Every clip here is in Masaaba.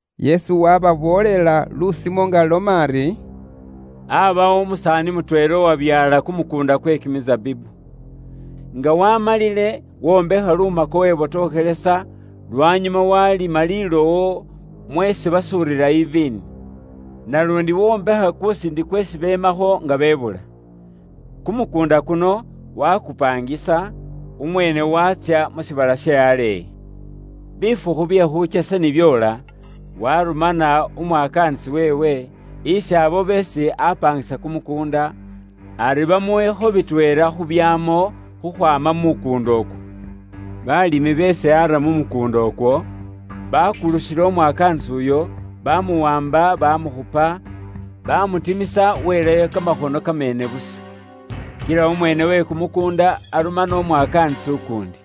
Yesu waababoolela lusimo nga aloma ari, “Aabawo umusaani mutweela uwabyaala kumukuunda kwe kimisabibu. Nga waamalile, wombekha lumako webotokhelesa, lwanyuma waalima lilowo mweesi basuurira iviini. Naluundi wombekha kusiindi kweesi beemakho nga bebuula. Kumukuunda kuno waakupaangisa, umweene waatsya mu shiibala she aleeyi. “Bifukhu bye khuukyesa ni byoola, waarumana umwakaanisi weewe, isi abo beesi aapaangisa kumukuunda, ari bamuwekho bitweela khu byaamo khukhwaama mu mukuunda ukwo. Baalimi beesi aara mu mukuunda ukwo, baakulukhila umwakaanisi uyo, baamuwaamba baamukhupa, baamutimisa weelayo kamakhono kamaŋaara busa. “Kila umweene uwe kumukuunda arumana umwakaanisi ukuundi.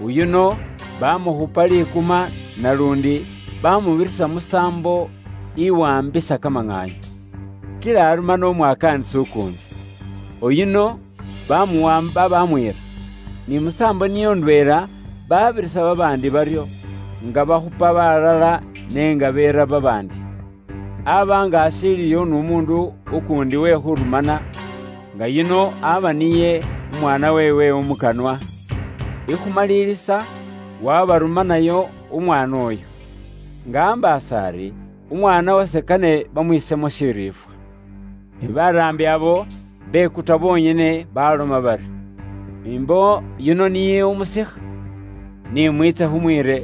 Uyuno baamukhupa likuma naluundi baamubirisa musaambo iwaambisa kamaŋaanyu. Kila arumana umwakaanisi ukuundi. Uyuno baamuwaamba baamwiira. Ni musaambo niyo ndweela baabirisa babaandi baryo, nga bakhupa balala ne nga beera babaandi. “Aaba nga ashiiliyo n'umuundu ukuundi uwe khuurumana, nga yuno aba niye umwaana weewe umukanwa. Ikhumalilisa waabarumanayo umwaana uyo, nga ambaasa ari, ‘Umwaana wase kane bamwiisemo shiriifwa.’ Ne baraambi abo bekuta bonyene baaloma bari, ‘Imbo yuno niye umusikha. Ni mwiitse khumwiire,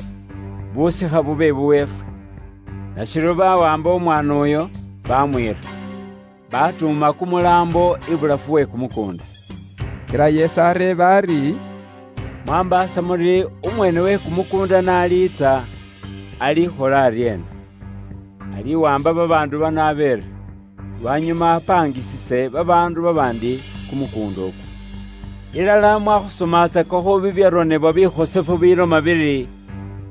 busikha bube bubweefwe.’ Nashiryo bawaamba umwaana uyo baamwiira. Baatuuma kumulaambo ibulafu we kumukuunda.” Kila Yesu areeba ari, “Mwaambaasa muri umweene uwe kumukuunda n'aliitsa, alikhola aryeena? Aliwaamba babaandu bano abeere, lwanyuma apaangisise babaandu babaandi kumukuunda ukwo. Ilala mwakhusomatsakakho bibyaronebwa bikhosefu bibiloma biri,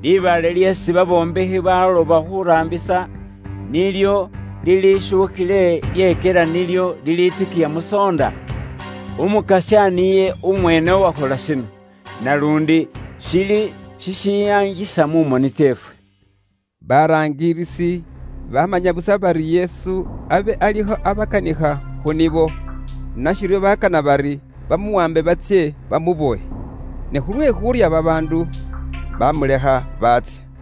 ‘Libaale lyeesi babombekhi bekaana khuuraambisa, nilyo lilishuukhile lyekyela nilyo liliitikiya musoonda? Umukasya niye umweene uwakhola shino, naluundi shili shishiyaangisa mu moni tseefwe.’” Baraangilisi bamanya busa bari Yesu abe alikho abakanikha khu nibo, nashiryo bakana bari bamuwambe batsye bamubowe. Ne khulwe khuurya babaandu, bamulekha baatsya.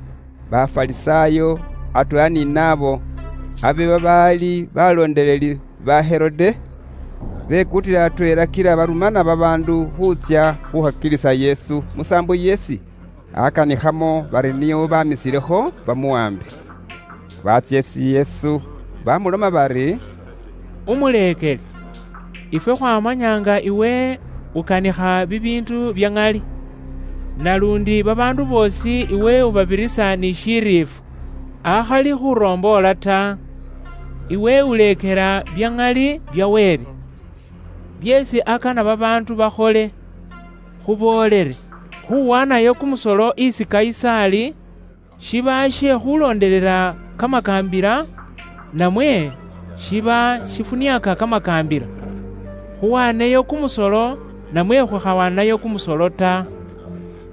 Bafarisaayo atweela ni naabo abe babaali baloondeleli ba Herode, bekutila atweela kila barumana babaandu khuutsya khukhakilisa Yesu musaambo yeesi akanikhamo bari nio bamisilekho bamuwambe. Baatsya isi Yesu bamuloma bari, “Umuleekeli, ifwe khwamaanya nga iwe ukanikha bibiindu bya ŋali. Naluundi babaandu boosi iwe ubabirisa ni shiriifwa, akhali khuromboola ta. Iwe uleekela bya ŋali bya Wele, byeesi akana babaandu bakhole. Khuboolele: Khuwaanayo kumusolo isi Kayisaali, Kayisaali abe niye umuyiinga uwe Baroma khu mbuka iyo, ne abe awula Yuda nayo. shiba she khulondelela kamakaambila, namwe shiba shifuniaaka kamakaambila? Khuwaneyo kumusolo, namwe khukhawaanayo kumusolo ta?”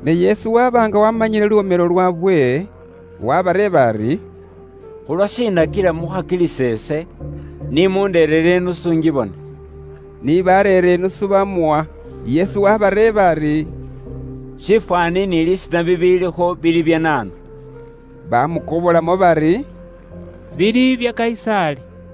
Ne Yesu waaba nga waamanyile luwomelo lwaabwe. Wabareeba ari, “Khulwashiina kila mukhakilisa ise? Ni mundereere idinari ingibone.” Ni bareera idinaari baamuwa, Yesu waabareeba ari, “Shifwaani ni lisiina bibiilikho bili bya naanu?” Baamukobolamo bari, “Bili bya Kayisaali.”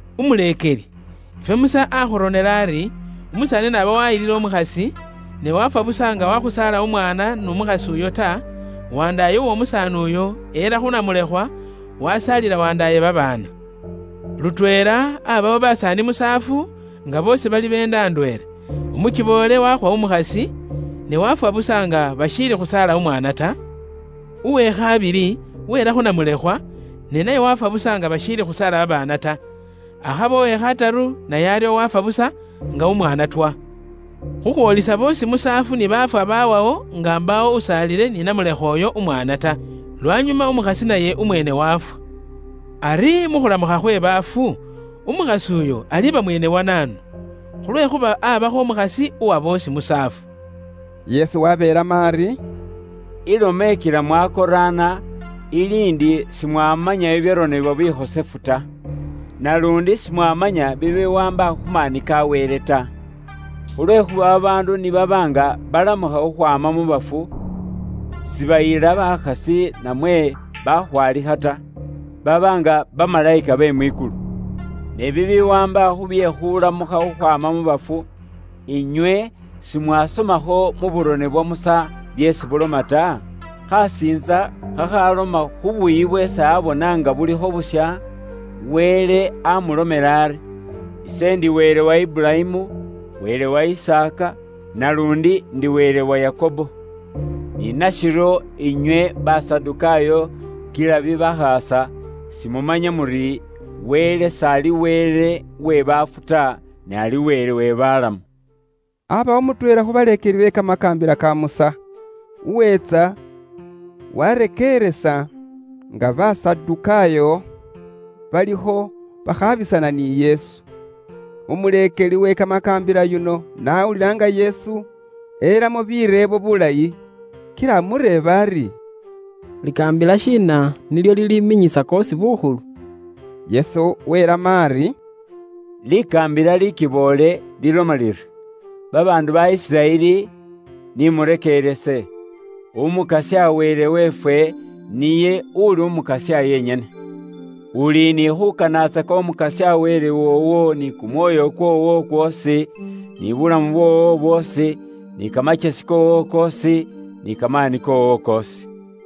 “Umuleekeli, ifwe Musa aakhuronela ari, umusaani n'aba waayilile umukhasi, ne waafwa busa nga waakhusaala umwaana n'umukhasi uyo ta, wandaaye w'omusaani uyo eela khu namulekhwa, wasaalila wandaaye babaana. Lutweela aabawo basaani musaafu, nga boosi bali wandaaye ni wandaaye. Umukiboole waakhwa umukhasi, ne waafwa busa nga bashiili khusaala umwaana ta. Uwe khabili weela khu namulekhwa, ne naye waafwa busa nga bashiili khusaala babaana ta. Akhaba uwe khataru naye aryo waafwa busa, nga umwaana twa, khukhwoolisa boosi musaafu ni baafwa baawawo nga mbaawo usaalile ni namulekhwa uyo umwaana ta. Lwanyuma umukhasi naye umweene waafwa. Ari mu khulamukha khwe baafu, umukhasi uyo aliba mwene wa naanu? Khulwekhuuba aabakho umukhasi uwa boosi musaafu.” Yesu waabeelamo ari, “Ilomo ikila mwakoraana ili ndi simwamanya bibyaronebwa bikhosefu ta! Naluundi simwaamanya bibiwaamba khu maani ka Wele ta. Khulwekhuuba babaandu ni baba nga balamukha khukhwaama mu bafu, sibayila bakhasi namwe bakhwaalikha ta. Baba nga bamalayika be mwikulu. Ne bibiwaamba khu bye khulamukha khukhwaama mu bafu, inywe simwaasomakho mu burone bwa Musa byeesi buloma ta? Khasiintsa khakhawaamba khu shitsakha she kamawa sheesi niye aabona nga shilikho shisha, Wele aamulomela ari, ‘Ise ndi Wele wa Iburayimu, Wele wa Isaaka, naluundi ndi Wele wa Yakobo.’ Ni nashiryo inywe Basadukaayo kila bibakhaasa, simumanya muri Wele s'ali Wele uwe baafu ta, ne ali Wele we balamu.” Aabawo mutweela khu baleekeli be Kamakaambila ka Musa, uweetsa waarekeeresa nga Basadukaayo balikho bakhaabisana ni Yesu. Umuleekeli uwe Kamakaambila yuno n'awulila nga Yesu elamo bireebo bulayi, kila amureeba ari, “Likaambila shiina nilyo liliiminyisa koosi bukhulu?” Yesu weelamo ari, “Likaambila liikiboole liloma liri, ‘Babaandu ba Isiraeli, ni murekeerese: Umukasya Wele weefwe, niye uli Umukasya yenyene; uli ni khuukanatsaka Umukasya Wele woowo ni kumwoyo kwoowo kwoosi, ni buulamu bwoowo bwoosi, ni kamakyesi koowo koosi, ni kamaani koowo koosi.’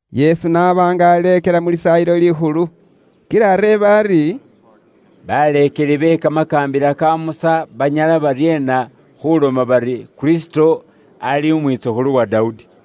Yesu n'aba nga aleekela mu Lisaayilo Likhulu, kila areeba ari, “Baleekeli be Kamakaambila ka Musa banyala baryeena khuloma bari Kristo ali umwitsukhulu wa Dawudi?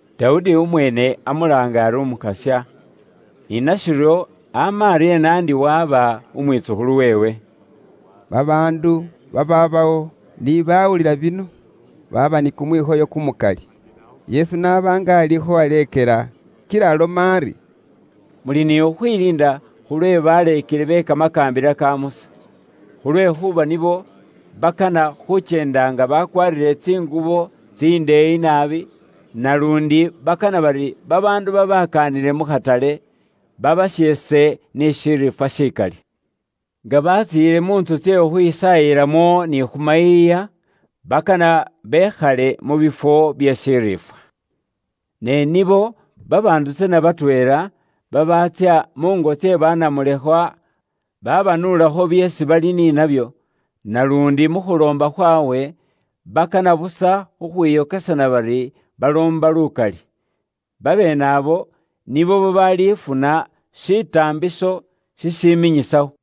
“Dawudi umweene amulaanga ari ‘Umukasya’; ni nashiryo ama aryeena ndi waba umwitsukhulu weewe?” Babaandu babaabawo ni bawulila bino baaba ni kumwikhoyo kumukali. Yesu n'aba nga alikho aleekela kila aloma ari, “Muli ni khukhwiliinda khulwe baleekeli be Kamakaambila ka Musa. Khulwekhuuba nibo bakana khukyenda nga bakwaarire tsingubo tsindeeyi naabi, naluundi bakana bari babaandu babakaanile mu khatale, babasheese ni shiriifwa shikali. Nga batsiile mu ntsu tsye khukhwisaayilamo ni khu mayiiya, bakana bekhale mu bifwo bye shiriifwa. Ne nibo babaandu tsana batweela babaatsya muungo tsye banamulekhwa babanuulakho byeesi bali ni nabyo; naluundi mu khuloomba khwaabwe bakana busa khukhwiyokesana bari baloomba lukali. Babeene abo nibo babaalifuna shitaambiso shishiminyisawo.”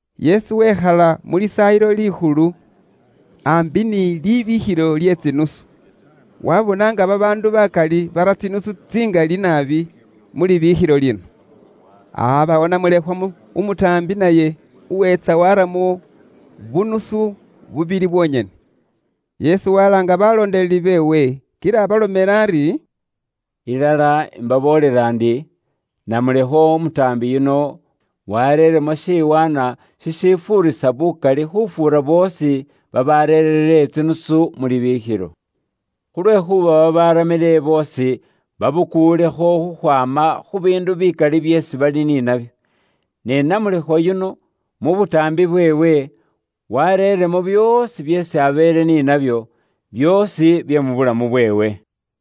Yesu wekhala mu Lisaayilo Likhulu, aambi n'isanduuku iye libiikhilo lye tsinusu. Waabona nga babaandu bakali bara tsinusu tsingali naabi mu libikhilo lino. Aabawo namulekhwa umutaambi naye uweetsa waaramo bunusu bubili bwonyene. Yesu walaanga baleekelwa beewe kila abalomela ari, “Ilala imbaboolela indi namulekhwa umutaambi yuno waareeremo shiwaanwa shishifuurisa bukali khufuura boosi babaareere tsinusu mu sanduuku iye libiikhilo. Khulwekhuuba babaaramile boosi babukulekho khukhwaama khu biindu bikali byeesi bali ni babyo. Ne namulekhwa yuno mu butaambi bweewe, wareeremo byoosi byeesi abeele ni nabyo, byoosi bye mu bulamu bweewe.”